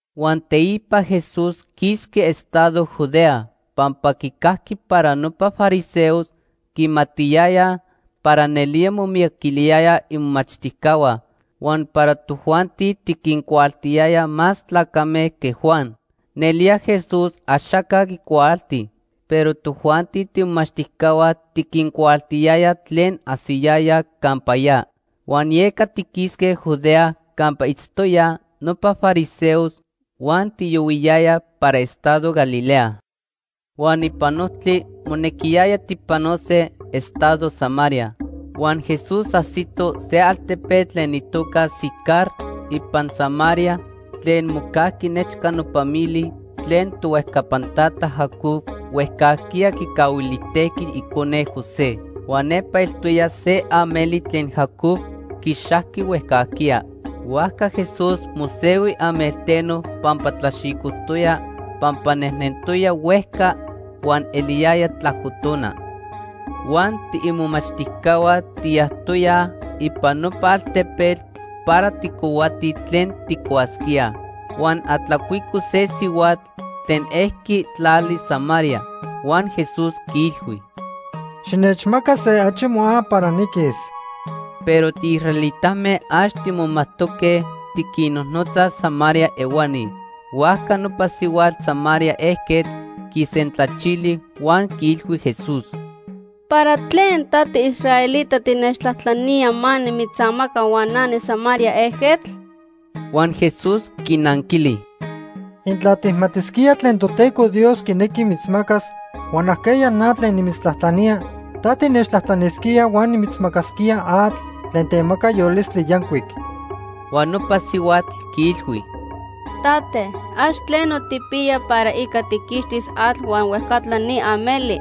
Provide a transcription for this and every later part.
Huan teipa Jesús quisqui estado Judea pampa quicajqui para nopa fariseos quimatiyayaj para nelía momiyaquiliyayaj imomachtijcahua huan para tojuanti tiquincuaaltiyayaj más tlacame que Juan. Nelía Jesús axaca quicuaalti, pero tojuanti tiimomachtijcahua tiquincuaaltiyayaj tlen ajsiyayaj campa ya. Huan yeca tiquisque Judea campa itztoyaj nopa fariseos huan tiyohuiyayaj para estado Galilea. Huan ipan ojtli monequiyaya tijpanose estado Samaria. Huan Jesús ajsito se altepetl tlen itoca Sicar ipan Samaria tlen mocajqui nechca nopa mili tlen tohuejcapan tata Jacob huejcajquiya quicahuilijtejqui icone José. Huan nepa eltoya se ameli tlen Jacob quixajqui huejcajquiya. Huajca Jesús mosehui amelteno pampa tlaxicojtoya pampa nejnentoya huejca huan eliyaya tlajco tona. Huan tiimomachtijcahua tiyajtoyaj ipan nopa altepetl para tijcohuatij tlen tijcuasquíaj. Huan atlacuico se sihuatl tlen ejqui tlali Samaria huan Jesús quiilhui: ―Xinechmaca se achi moa para niquis. Pero tiisraelitame ax timomajtoque tiquinnojnotzaj Samaria ehuani. Huajca nopa sihuatl Samaria ejquetl quisentlachili huan quiilhui Jesús: ―¿Para tlen ta tiisraelita tinechtlajtlanía ma nimitzamaca huan na niSamaria ejquetl? Huan Jesús quinanquili: ―Intla tijmatisquía tlen Toteco Dios quinequi mitzmacas huan ajqueya na tlen nimitzatlajtlanía, ta tinechtlajtlanisquía huan nimitzmacasquía atl tlen temaca yolistli yancuic. Huan nopa sihuatl quiilhui: ―Tate, ax tleno tijpiya para ica tijquixtis atl huan huejcatla ni ameli.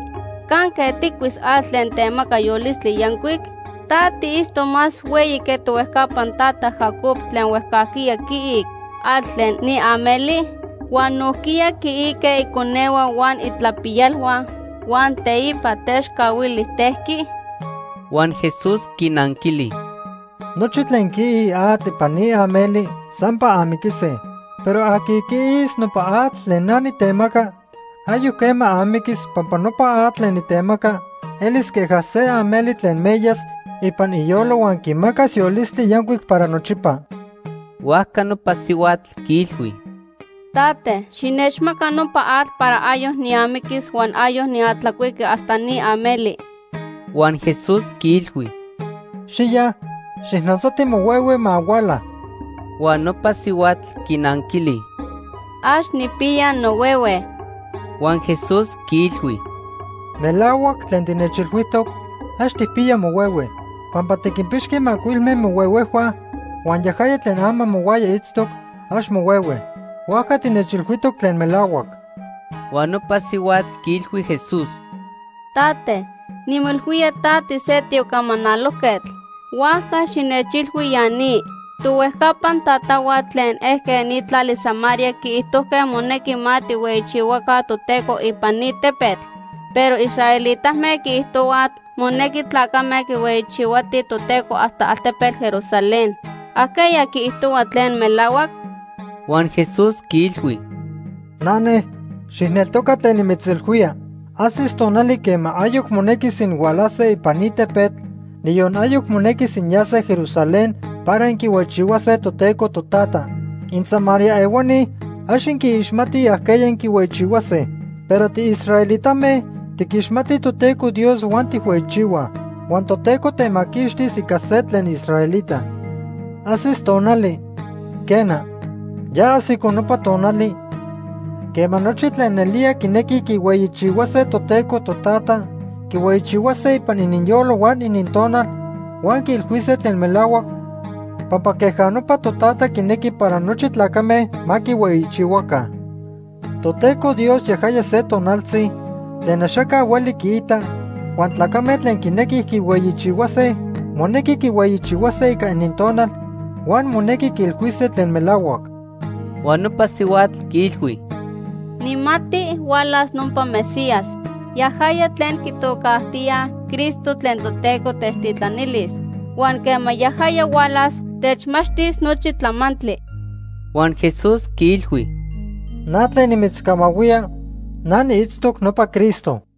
¿Canque tijcuis atl tlen temaca yolistli yancuic? ¿Ta tiitztoc más hueyi que tohuejcapan tata Jacob tlen huejcajquiya quiic atl tlen ni ameli, huan nojquiya quiique iconehua huan itlapiyalhua, huan teipa techcahuilijtejqui? Huan Jesús quinanquili: ―Nochi tlen quiij atl ipan ni ameli sampa amiquise. Pero aqui quiis nopa atl tlen na nitemaca, ayoc quema amiquis pampa nopa atl tlen nitemaca elis queja se ameli tlen meyas ipan iyolo huan quimacas yolistli yancuic para nochipa. Huajca nopa sihuatl quiilhui: ―Tate, xinechmaca nopa atl para ayoc niamiquis huan ayoc niatlacuiqui hasta ni ameli. Huan Jesús quiilhui: ―Xiya, xijnotzati mohuehue ma huala. Huan nopa sihuatl quinanquili: ―Ax nijpiya nohuehue. Huan Jesús quiilhui: ―Melahuac tlen tinechilhuijtoc, ax tijpiya mohuehue. Pampa tiquinpixqui macuilme mohuehuejhua huan yajaya tlen ama mohuaya itztoc, ax mohuehue. Huajca tinechilhuijtoc tlen melahuac. Huan nopa sihuatl quiilhui Jesús: ―Tate, nimoilhuía ta tise tiocamanalojquetl. Huajca xinechilhui ya ni. Tohuejcapan tatahua tlen ejque ni tlali Samaria quiijtojque monequi ma tijhueyichihuaca Toteco ipan ni tepetl, pero inisraelitame inquiijtohuaj monequi tlacame quihueyichihuatij Toteco hasta altepetl Jerusalén. ¿Ajqueya quiijtohua tlen melahuac? Huan Jesús quiilhui: ―Nane, xijneltoca tlen nimitzilhuía. Ajsis tonali quema ayoc monequis inhualase ipan ni tepetl, niyon ayoc monequis inyase Jerusalén para inquihueyichihuase Toteco Totata. InSamaria ehuani ax inquiixmatij ajqueya inquihueyichihuase. Pero tiisraelitame tiquixmatij Toteco Dios huan tijhueyichihuaj. Huan Toteco temaquixtis ica se tlen israelita. Ajsis tonali, quena, ya ajsico nopa tonali, quema nochi tlen nelía quinequij quihueyichihuase Toteco Totata quihueyichihuase ipan ininyolo huan inintonal huan quiilhuise tlen melahuac pampa queja nopa Totata quinequi para nochi tlacame ma quihueyichihuaca. Toteco Dios yajaya se tonaltzi tlen axaca hueli quiita, huan tlacame tlen quinequij quihueyichihuase monequi quihueyichihuase ica inintonal huan monequi quiilhuise tlen melahuac. Huan nopa sihuatl quiilhui: ―Nijmati hualas nopa Mesías, yajaya tlen quitocajtíaj Cristo tlen Toteco techtitlanilis. Huan quema yajaya hualas, techmachtis nochi tlamantli. Huan Jesús quiilhui: ―Na tlen nimitzcamahuía, na niitztoc nopa Cristo.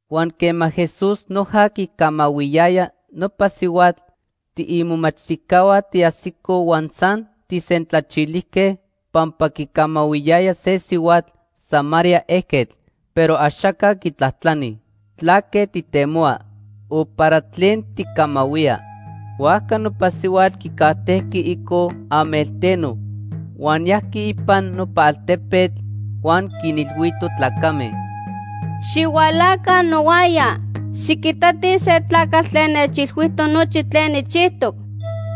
Huan quema Jesús noja quicamahuiyaya nopa sihuatl, tiimomachtijcahua tiajsicoj huan san tijsentlachilijque pampa quicamahuiyaya se sihuatl Samaria ejquetl, pero axaca quitlajtlani: “¿Tlaque tijtemohua?” o “¿para tlen tijcamahuía?” Huajca nopa sihuatl quicajtejqui ico amelteno huan yajqui ipan nopa altepetl huan quinilhuito tlacame: ―Xihualaca nohuaya, xiquitatij se tlacatl tlen nechilhuijtoc nochi tlen nijchijtoc.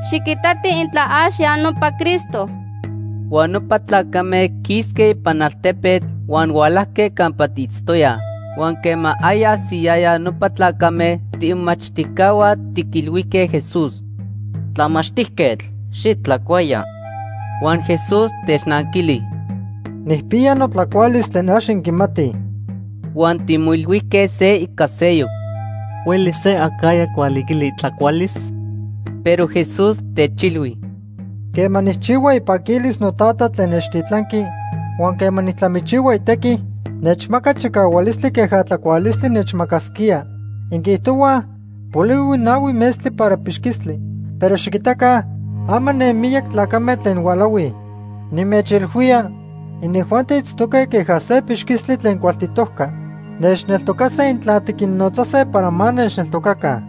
Xiquitatij intla ax ya nopa Cristo. Huan nopa tlacame quisque ipan altepetl huan hualajque campa tiitztoyaj. Huan quema aya ajsiyayaj nopa tlacame, tiimomachtijcahua tiquilhuijque Jesús: ―Tlamachtijquetl, xitlacuaya. Huan Jesús technanquili: ―Nijpiya notlacualis tlen ax inquimatij. Huan timoilhuijque se ica seyoc: ―¿Huelis se acajya quihualiquili itlacualis? Pero Jesús techilhui: ―Quema nijchihua ipaquilis noTata tlen nechtitlanqui huan quema nijtlamichihua itequi, nechmaca chicahualistli queja tlacualistli nechmacasquía. Inquiijtohuaj polihui nahui metztli para pixquistli. Pero xiquitaca ama ne miyac tlacame tlen hualahuij. Nimechilhuía, inijuanti itztoque queja se pixquistli tlen cualtitojca. Nechneltocase intla tiquinnotzase para ma nechneltocaca.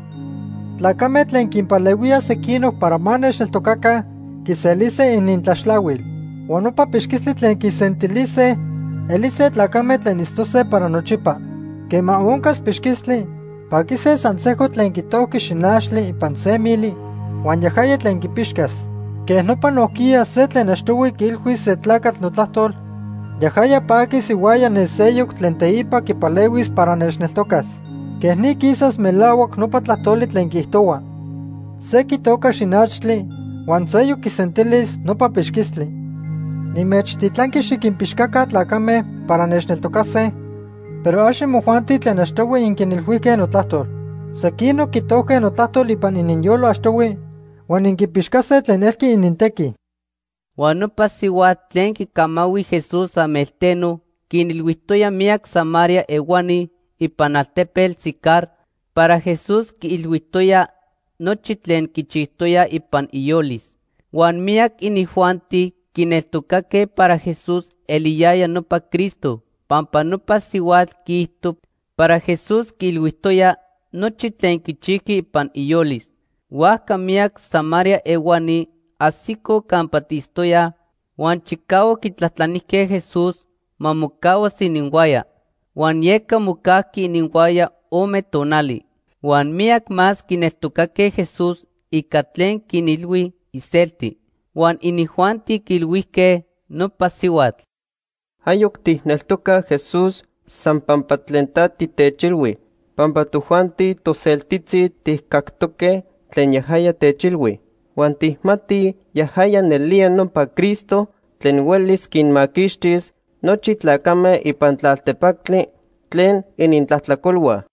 Tlacame tlen quinpalehuíaj sequinoc para ma nechneltocaca quiselise inintlaxtlahuil. Huan nopa pixquistli tlen quisentilise elise tlacame tlen itztose para nochipa. Quema oncas pixquistli, paquise san sejco tlen quitojqui xinachtli ipan se mili huan yajaya tlen quipixcas. Quej nopa nojquiya se tlen achtohui quiilhuis se tlacatl notlajtol, yajaya paquis ihuaya ne seyoc tlen teipa quipalehuis para nechneltocas. Quej ni quisas melahuac nopa tlajtoli tlen quiijtohua: ‘Se quitoca xinachtli huan seyoc quisentilis nopa pixquistli.’ Nimechtitlanqui xiquinpixcaca tlacame para nechneltocase, pero ax imojuanti tlen achtohui inquinilhuijque notlajtol. Sequinoc quitojque notlajtol ipan ininyolo achtohui huan inquipixcase tlen elqui inintequi. Huan nopa sihuatl tlen quicamahui Jesús amelteno quinilhuijtoya miyac Samaria ehuani ipan altepetl Sicar para Jesús quiilhuijtoya nochi tlen quichijtoya ipan iyolis. Huan miyac inijuanti quineltocaque para Jesús eliyaya nopa Cristo pampa nopa sihuatl quiijto para Jesús quiilhuijtoya nochi tlen quichijqui ipan iyolis. Huajca miyac Samaria ehuani ajsicoj campa tiitztoyaj huan chicahuac quitlajtlanijque Jesús ma mocahuas ininhuaya. Huan yeca mocajqui ininhuaya ome tonali. Huan miyac más quineltocaque Jesús ica tlen quinilhui iselti. Huan inijuanti quiilhuijque nopa sihuatl: ―Ayoc tijneltocaj Jesús san pampa tlen ta titechilhui pampa tojuanti toseltitzi tijcactoque tlen yajaya techilhui, huan tijmatij yajaya nelía nopa Cristo tlen huelis quinmaquixtis nochi tlacame ipan tlaltepactli tlen inintlajtlacolhua.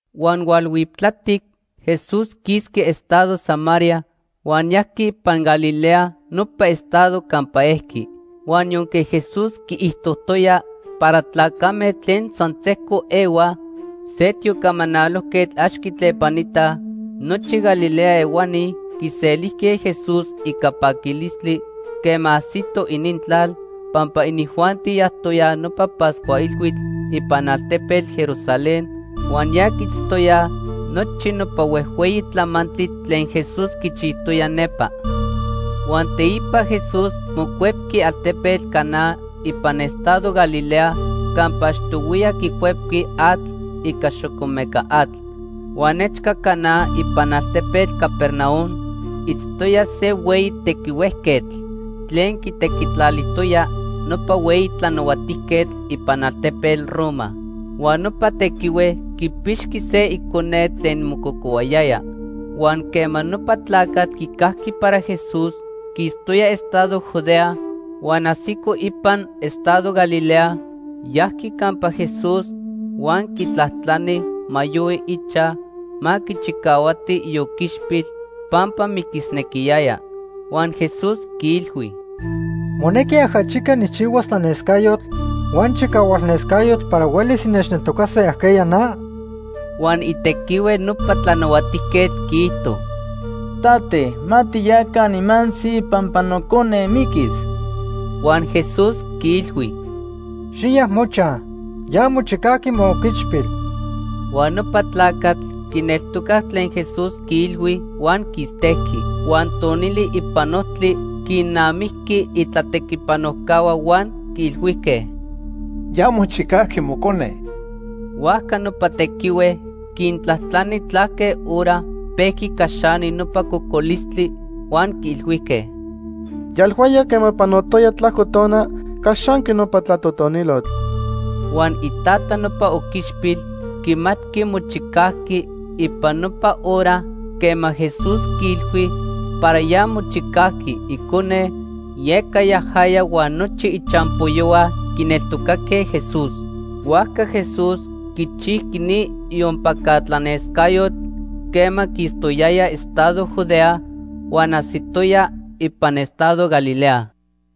Huan hualhuiptlatic, Jesús quisqui estado Samaria huan yajqui ipan Galilea nopa estado campa ejqui. Huan yonque Jesús quiijtojtoya para tlacame tlen san sejco ehuaj se tiocamanalojquetl ax quitlepanitaj, nochi Galilea ehuani quiselijque Jesús ica paquilistli quema ajsito inintlal, pampa inijuanti yajtoyaj nopa Pascua Ilhuitl ipan altepetl Jerusalén huan ya quiitztoyaj nochi nopa huejhueyi tlamantli tlen Jesús quichijtoya nepa. Huan teipa Jesús mocuepqui altepetl Caná ipan estado Galilea campa achtohuiya quicuepqui atl ica xocomeca atl. Huan nechca Caná ipan altepetl Capernaum itztoya se hueyi tequihuejquetl tlen quitequitlalijtoya nopa hueyi tlanahuatijquetl ipan altepetl Roma. Huan nopa tequihue quipixqui se icone tlen mococohuayaya. Huan quema nopa tlacatl quicajqui para Jesús quistoya estado Judea huan ajsico ipan estado Galilea, yajqui campa Jesús huan quitlajtlani ma yohui ichaj ma quichicahuati ioquichpil pampa miquisnequiyaya. Huan Jesús quiilhui: ―¿Monequi ajachica nijchihuas tlanescayotl huan chicahualnescayotl para huelis innechneltocase ajqueya na? Huan itequihue nopa tlanahuatijquetl quiijto: ―Tate, ma tiyaca nimantzi pampa nocone miquis. Huan Jesús quiilhui: ―Xiya mochaj. Ya mochicajqui mooquichpil. Huan nopa tlacatl quineltocac tlen Jesús quiilhui huan quistejqui. Huan tonili ipan ojtli quinnamijqui itlatequipanojcahua huan quiilhuijque: ―Ya mochicajqui mocone. Huajca nopa tequihue quintlajtlani tlaque hora pejqui caxani nopa cocolistli, huan quiilhuijque: ―Yalhuaya quema panotoya tlajco tona caxanqui nopa tlatotonilotl. Huan itata nopa oquichpil quimatqui mochicajqui ipan nopa hora quema Jesús quiilhui para ya mochicajqui icone, yeca yajaya huan nochi ichampoyohua quineltocaque Jesús. Huajca Jesús quichijqui ni iompaca tlanescayotl quema quistoyaya estado Judea huan ajsitoya ipan estado Galilea.